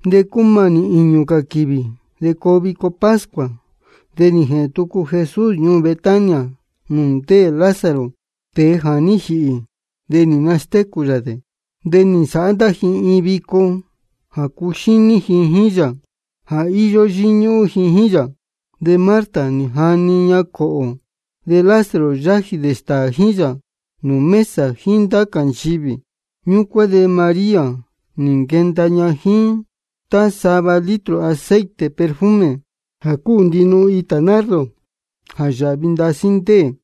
De cúmanī īñū cā quīvī de coo vico pascua. De nī jēhēn tucu Jesús ñuū Betania nūū ndéē Lázaro, tēe jā ní jīhī de nī nastécū yā dē. De nī nsāhá ndá ji iin vico jā cuxíní ji jíín yā jā íyó yíñúhún ji jíín yā. De Marta nī jani ña cōhō. De Lázaro yájī dē stāā jíín yā nūū mesa jíín ndá cā nchivī. Ñúcuán de María nī nquenda ña jíín tá sava litro aceite perfume jā cúu ndinuhun itā nardo, jā yāhvi ndasí ndéē.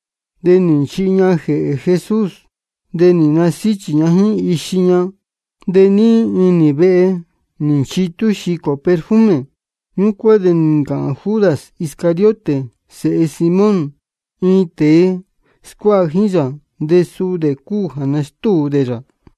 De nī nchihi ña jēhē Jesús, de nī nasíchī ña jíín ixi ña. De níí inī vehe nī nchitú xicō perfume. Ñúcuán de nī ncāhān Judas Iscariote sēhe Simón, iin tēe scuáha jíín yā, de suu dē cúu jā nastúu dē yā: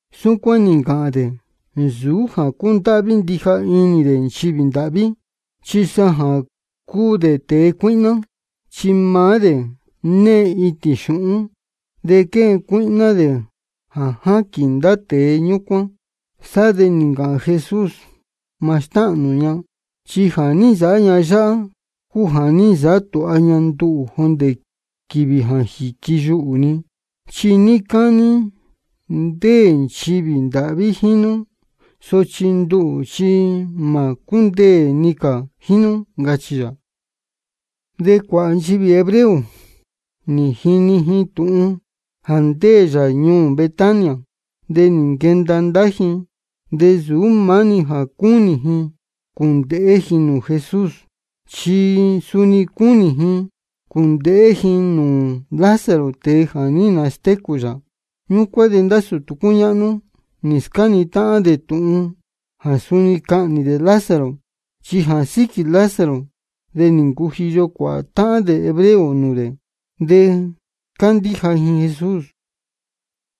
Súcuán nī ncāhān dē, nsūú jā cúndáhví ndija inī dē nchivī ndāhví, chi sa jā cúu dē tēe cuíhná. Chi maá dē née itīn xūhún, de quéhen cuíhná dē jā jáquīn ndá tēe ñúcuán. Sá de nī ncāhān Jesús: Mā stáhān nū ña. Chi jā ní nsāhá ña yáhá cúu jā ní nsāhá tūha ña nduhū jōndē quīvī jā quiyuhū ni. Chi níí cání ndéē nchivī ndāhví jíín nú, sochi nduhū chi mā cúndeē ni cā jíín nú, ncachī yā. De cuāhā nchivī hebreo nī jini ji tūhun jā ndéē yā ñuū Betania. De nī nquenda ndá ji, de nsūú maá-ni jā cúnī ji cūndēhé ji nūū Jesús, chi suni cúnī ji cūndēhé ji nūū Lázaro, tēe jā ní nastécū yā. Ñúcuán de ndá sūtū cúñáhnú nī scáni táhán dē tūhun jā suni cahnī dē Lázaro. Chi jā síquī Lázaro de nī ncujiyo cuāhā táhán dē hebreo nūū dē, de cándíja ji Jesús.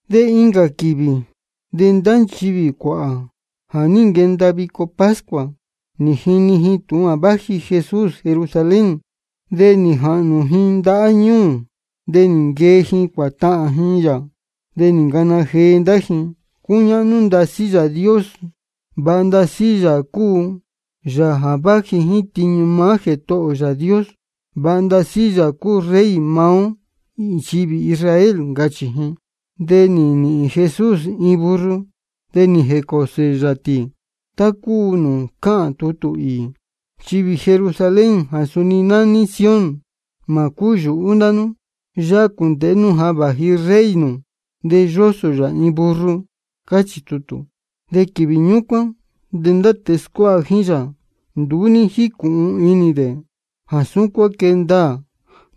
De incā quīvī, de ndá nchivī cuāhā jā ní nquenda vico pascua, nī jini ji tūhun jā váji Jesús Jerusalén. De nī jahnū ji ndahá ñūū, de nī nquee ji cuātahān ji yā. De nī ncana jee ndá ji: Cúñáhnú ndasí Yāā Dios. Vāha ndasí Yāā cúu Yāā jā váji jíín tiñu maá Jētohō ō Yāā Dios. Vāha ndasí Yāā cúu Rey maá ó nchivī Israel, ncachī ji. De nī nīhīn Jesús iin burro, de nī jēcōsō yā tī, tá cúu nūū cáhān tutū īī: Nchivī Jerusalén jā suni nání Sión, mā cúyūhú ndá nú. Yáhá cūndēhé nú jā váji Rey nū, de yósō yā iin burro. Cáchī tutū. De quīvī ñúcuán de ndá tēe scuáha jíín yā nduú ní jícūhun inī dē jā súcuán quée ndaā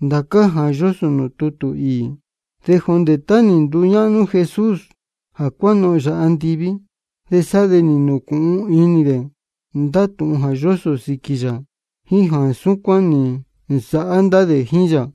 ndācá jā yósō nūū tutū īī. De jondē tá nī nduñáhnú Jesús jā cuánohōn yā andiví, de sá de nī nūcūhun inī dē ndá tūhun jā yósō sīquī yā, jíín jā súcuán nī nsāhá ndá dē jíín yā.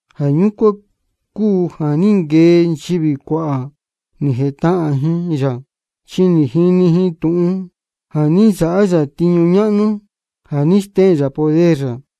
Jā ñúcuán cúu jā ní nquee nchivī cuāhā, nī jētahān ji yā, chi nī jini ji tūhun jā ní nsāhá yā tiñu ñáhnú jā ní stéhēn yā poder yā.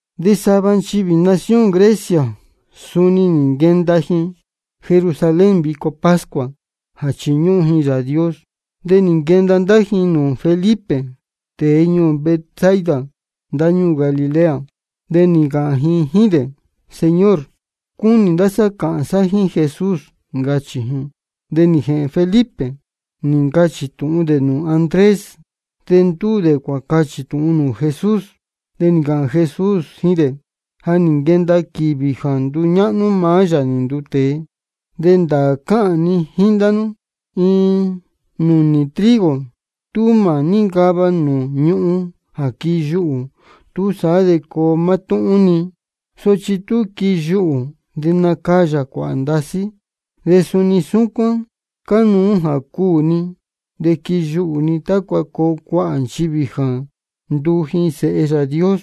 De sava nchivī nación Grecia, suni nī nquenda ji Jerusalén vico pascua jā chiñúhún ji Yāā Dios. De nī nquenda ndá ji nūū Felipe, tēe ñuū Betsaida ndáñúū Galilea. De nī ncāhān ji jíín dē: Señor, cúnī ndá sá cāhān sá jíín Jesús, ncachī ji. De nī jēhēn Felipe, nī ncachī tūhun dē nūū Andrés. De ndúū dē cuācachī tūhun dē nūū Jesús. De nī ncāhān Jesús jíín dē: Ja nī nquenda quīvī jā nduñáhnú maá Yāā nī nduu tēe. De ndāā cáhān ni jíín ndá nú, iin nūnī trigo tú mā níncava nūū ñūhún jā quiyuhū, túsaá de coo mátúhún-ni. Sochi tú quiyuhū, de nacayā cuāhā ndasí. De suni súcuán cánuú jā cuū ni de quiyuhū ni, tácua coo cuāhā nchivī jā nduu ji sēhe Yāā Dios.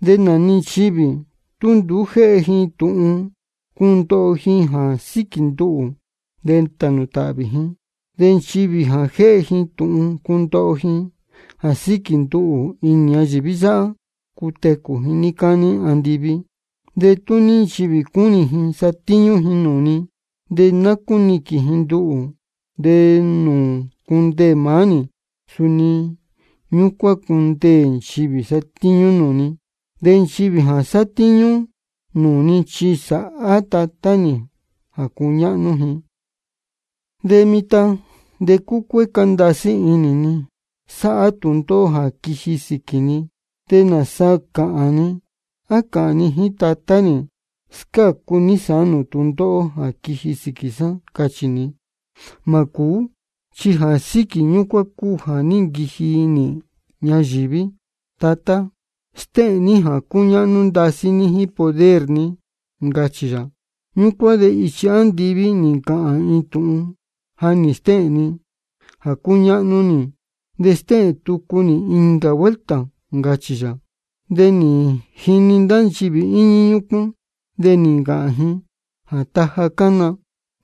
De nā-ni nchivī tú nduú jéhe ji tūhun cundoho ji jā síquī nduhū, de tānū tāhvī ji. De nchivī jā jéhe ji tūhun cundoho ji jā síquī nduhū inī ñayīví yáhá, cutecū ji níí cání andiví. De tú ní nchivī cúnī ji satíñú ji nūū ni, de ná cúniquīn ji nduhū. De nūū cundeē maá nī, suni ñúcuán cundeē nchivī sátíñú nūū ni. De nchivī jā sátíñú nūū ni chi sāhá Tatá nī jā cuñáhnú ji. De mitan de cúcuécá ndasí inī ni sáhá tūndóhó jā quiji sīquī ni. ¿De nāsa cāhān ni? ¿A cāhān ni jíín Tatá nī: Scácu ní sāán nūū tūndóhó jā quiji sīquī sá, cachī ni? Mā cūú, chi jā síquī ñúcuán cúu jā ní nquiji nī ñayīví. Tatá, stéhēn ní jā cúñáhnú ndasí ní jíín poder ní, ncachī yā. Ñúcuán de ichi andiví nī ncāhān iin tūhun: Ja nī stéhēn ni jā cúñáhnú nī, de stéhēn tucu nī incā vuelta, ncachī yā. De nī jini ndá nchivī íñí ñúcuán, de nī ncāhān ji jā taja cána.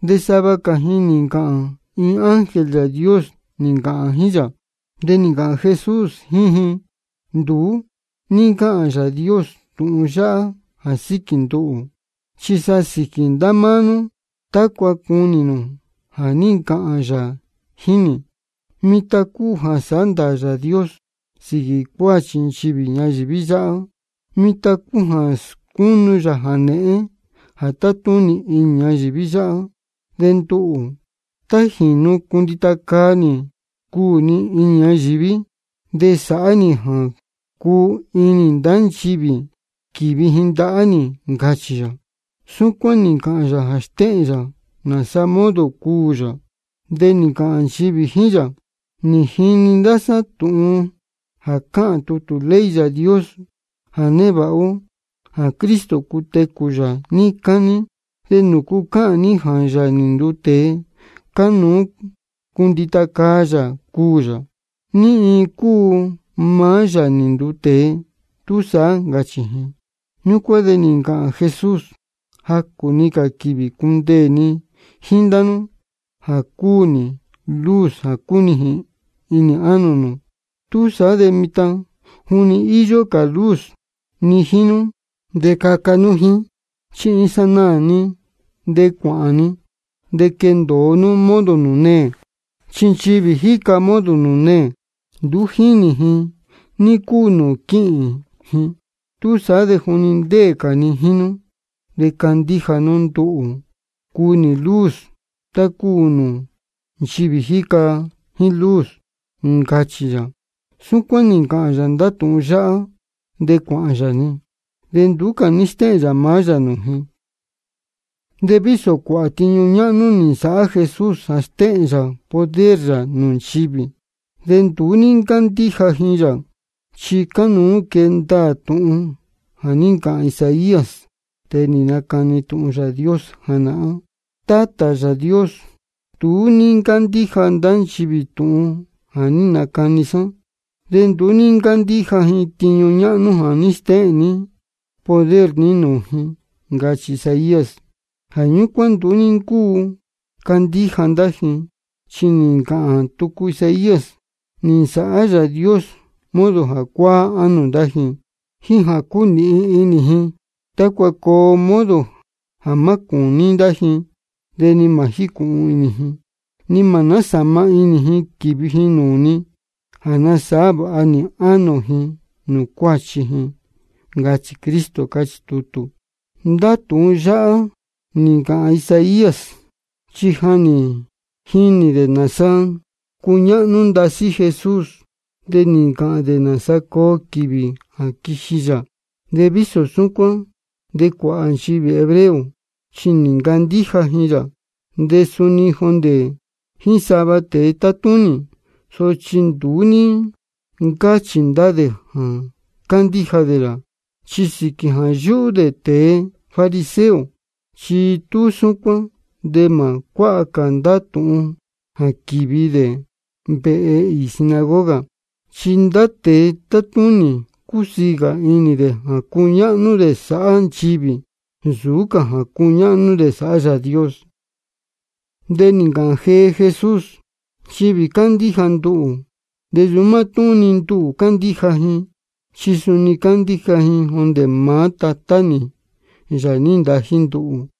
De sava cā ji nī ncāhān: Iin ángel Yāā Dios nī ncāhān jíín yā. De nī ncāhān Jesús jíín ji: Nduú ní ncáhān Yāā Dios tūhun yáhá jā síquī nduhū, chi sa sīquī ndá máá nú tácua cunī nū jā ní ncāhān yā jíín nī. Mitan cúu jā sándaā Yāā Dios sīquī cuāchi nchivī ñayīví yáhá. Mitan cúu jā scúnu yā jānēhén jā tátúnī inī ñayīví yáhá. De nduhū, tá jīnu cundita caa nī cuū ni inī ñayīví, de sāhá nī jā cuu inī ndá nchivī quīvi ji ndahá nī, ncachī yā. Súcuán nī ncāhān yā jā stéhēn yā nāsa modo cuū yā. De nī ncāhān nchivī jíín yā: Nī jini ndá sá tūhun jā cáhān tutū ley Yāā Dios jā névāha ó, jā Cristo cutecū yā níí cání. ¿De nūcu cáhān ní jā Yāā nī nduu tēe, cánuú cundita caa yā cuū yā? ¿Ní iin cúu maá Yāā nī nduu tēe túsaá? ncachī ji. Ñúcuán de nī ncāhān Jesús: Jacū-ni cā quīvī cundeē ni jíín ndá nú jā cúu nī luz jā cúnijīn inī ánō nū. Túsaá de mitan juni íyó cā luz ni jíín nú, de caca nú jíín, chi iin sanaā-ni de cuāhān ni, de quendōo nú modo nūū neē. Chi nchivī jíca modo nūū neē, nduú jínī ji ní cúu nūū quíhīn ji. Túsaá de juni ndéē cā ni jíín nú, de candíja nú nduhū jā cúu nī luz, tácua nduu nú nchivī jíca jíín luz, ncachī yā. Súcuán nī ncāhān yā ndá tūhun yáhá, de cuāhān yā-ni, de nduú cā ní stéhēn yā maá yā nūū ji. De vísō cuāhā tiñu ñáhnú nī nsāhá Jesús jā stéhēn yā poder yā nūū nchivī, de nduú ní ncándíja ji yā. Chi cánuú quee ndaā tūhun jā ní ncāhān Isaías, tēe nī nacani tūhun Yāā Dios janahán: Tátā Yāā Dios, nduú ní ncándíja ndá nchivī tūhun jā ní nacani sá, de nduú ní ncándíja ji tiñu ñáhnú jā ní stéhēn ní poder ní nūū ji. Ncachī Isaías. Jā ñúcuán nduú ní ncúu candíja ndá ji, chi nī ncāhān tucu Isaías: Nī nsāhá Yāā Dios modo jā cuáá ánō ndá ji, jíín jā cúnīhin inī ji, tácua coo modo jā má cūní ndá ji, de ni mā jícūhun inī ji, ni mā násāma inī ji quīvi ji nūū ni, jā nasāhá vāha nī ánō ji nūū cuáchi ji. Ncachī Cristo, cáchī tutū. Ndá tūhun yáhá nī ncāhān Isaías, chi ja nī jinī dē nāsa cúñáhnú ndasí Jesús, de nī ncāhān dē nāsa coo quīvī jā quiji yā. De vísō súcuán de cuāhā nchivī hebreo chi nī ncandíja ji yā, de suni jondē jíín sava tēe tátúnī. Sochi nduú ní ncáchī ndá dē jā cándíja dē yā, chi sīquī jā yúhú dē tēe fariseo. Chi tú súcuán de mā cuáha cā ndá tūhun jā quīvi dē vehe īī sinagoga. Chi ndá tēe tátúnī cúsiī cā inī dē jā cuñáhnú dē sāhá nchivī, nsūú cā jā cuñáhnú dē sāhá Yāā Dios. De nī ncāhān jee Jesús: Nchivī cándíja nduhū, de nsūú mátúhún-ni nduhū cándíja ji, chi suni cándíja ji jondē maá Tatá nī, Yāā nī ntají nduhū.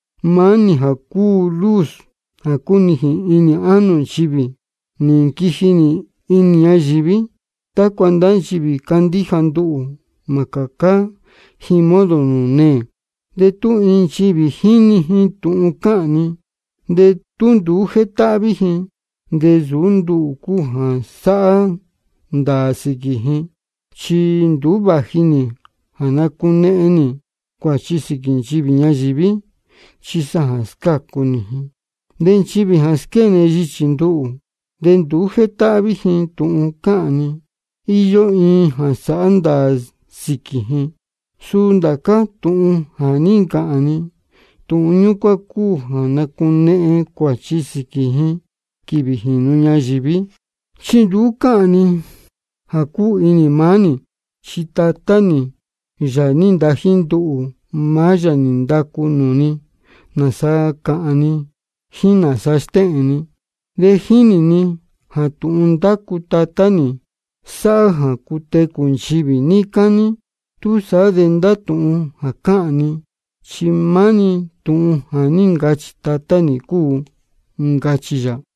Maá nī jā cúu luz jā cúnijīn inī ánō nchivī, nī nquiji nī inī ñayīví tácua ndá nchivī cándíja nduhū, mā cācá ji modo nūū neē. De tú iin nchivī jíni ji tūhun cáhān ni, de tú nduú jétáhví ji, de nsūú nduhū cúu jā sāhá ndāā sīquī ji. Chi nduú vāji nī jā nacunehen nī cuāchi sīquī nchivī ñayīví, chi sa jā scácu nī ji. De nchivī jā squéne yichī nduhū, de nduú jétáhví ji tūhun cáhān ni, íyó iin jā sāhá ndāā sīquī ji. Suu ndācá tūhun jā ní ncāhān ni, tūhun ñúcuán cúu jā nacunehen cuāchi sīquī ji quīvī jīnu ñayīví. Chi nduú cáhān ni jā cúu inī maá nī, chi Tatá nī, Yāā nī ntají nduhū, maá yā nī ndacu nūū ni nāsa cāhān ni jíín nāsa stéhēn ni. De jínī ni jā tūhun ndácu Tatá nī sáhá jā cutecū nchivī níí cání. Túsaá de ndá tūhun jā cáhān ni, chi maá-ni tūhun jā ní ncachī Tatá nī cúu, ncachī yā.